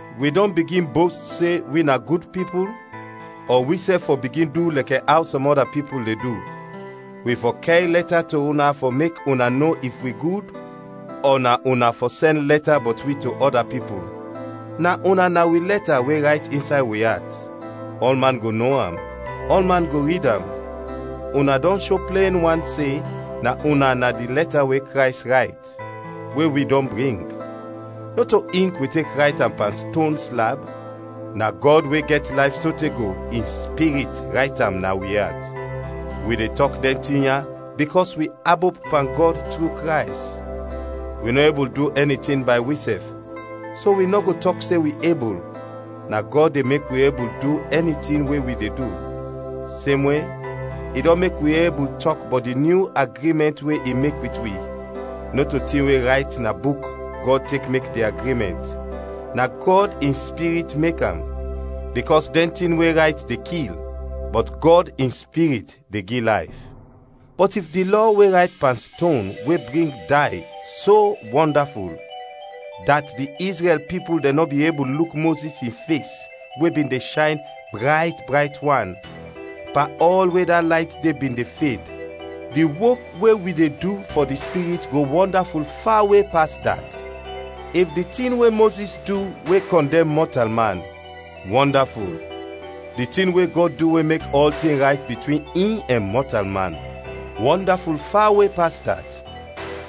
Wi dɔn bigin bost se wi na gud pipul? Ɔ wisɛf fɔ bigin du lɛkɛ aw sɔm ɔda pipul de du, wi fɔ kɛr lɛta to una fɔ mek una no if wi gud? Ɔ na una fɔ sɛn lɛta bɔt wi to ɔda pipul? Na una na wi lɛta we rayt insay wi at, ɔlman go no am, ɔlman go rid am. Una dɔn sho plen wan se na una na di lɛta we Krays rayt, we wi dɔn bring. Nɔto ink wi tek rayt am pan ston slab, na Gɔd we gɛt layf sote go, in Spirit rayt am na wi at. Wi de tɔk dɛn tin ya bikɔs wi abop pan Gɔd tru Krays. Wi nɔ ebul du ɛni tin bay wisɛf, so wi nɔ go tɔk se wi ebul, na Gɔd de mek wi ebul du ɛni tin we wi de du. Semwe, i dɔn mek wi ebul tɔk bɔt di nyu agrimɛnt we i mek wit wi; nɔto tin we rayt na buk Gɔd tek mek di agrimɛnt, na Gɔd in Spirit mek am; bikɔs dɛn tin we rayt de kil, bɔt Gɔd in Spirit de gi layf. Bɔt if di Lɔ we rayt pan ston we bring day so wɔndaful, dat di Izrɛl pipul dɛn nɔ bin ebul luk Mozis in fes we bin de shayn brayt brayt wan, pan ɔl we da layt de bin de fed, di wok we wi de du fɔ di Spirit go wɔndaful fawe pas dat! If di tin we Mozis du we kɔndɛm mɔtalman, wɔndaful, di tin we Gɔd du we mek ɔltin rayt bitwin in ɛn mɔtalman, wɔndaful fawe pas dat.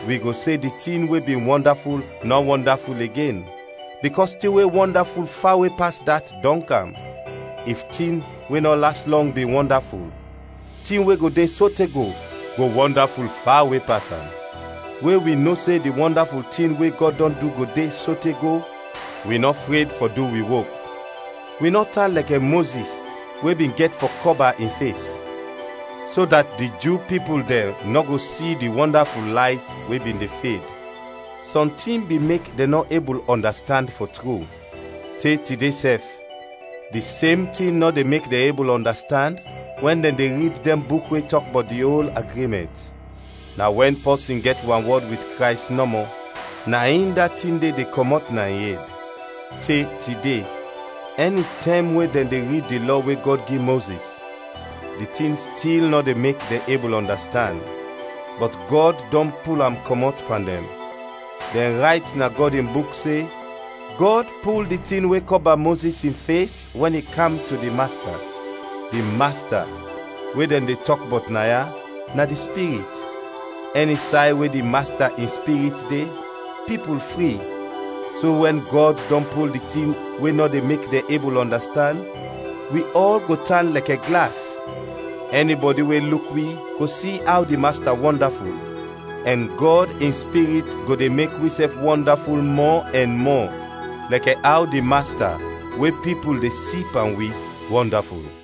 Wi go se di tin we bin wɔndaful nɔ wɔndaful igen, bikɔs tin we wɔndaful fawe pas dat dɔn kam. If tin we nɔ las lɔng bin wɔndaful, tin we go de sote go, go wɔndaful fawe pas am. We wi no se di wɔndaful tin we Gɔd dɔn du go de sote go, wi nɔ fred fɔ du wi wok. Wi nɔ tan lɛkɛ Mozis we bin gɛt fɔ kɔba in fes, so dat di Ju pipul dɛn nɔ go si di wɔndaful layt we bin de fed. Sɔntin bin mek dɛn nɔ ebul ɔndastand, fɔ tru; te tide sɛf di sem tin nɔ de mek dɛn ebul ɔndastand wɛn dɛn de rid dɛn buk we tɔk bɔt di ol agrimɛnt. Na wɛn pɔsin gɛt wanwɔd wit Krays nɔmɔ, na in da tin de de kɔmɔt na in ed. Te tide, ɛnitɛm we dɛn de rid di Lɔ we Gɔd gi Mozis, di tin stil nɔ de mek dɛn ebul ɔndastand. Bɔt Gɔd dɔn pul am kɔmɔt pan dɛn; dɛn rayt na Gɔd in Buk se, “Gɔd pul di tin we kɔba Mozis in fes wɛn i kam to di Masta.” Di “Masta” we dɛn de tɔk bɔt naya, na di Spirit; ɛni say we di Masta in Spirit de, pipul fri. So wɛn Gɔd dɔn pul di tin we nɔ de mek dɛn ebul ɔndastand, wi ɔl go tan lɛkɛ glas; ɛnibɔdi we luk wi go si aw di Masta wɔndaful, ɛn Gɔd in Spirit go de mek wisɛf wɔndaful mɔ ɛn mɔ, lɛkɛ aw di Masta, we pipul de si pan wi, wɔndaful.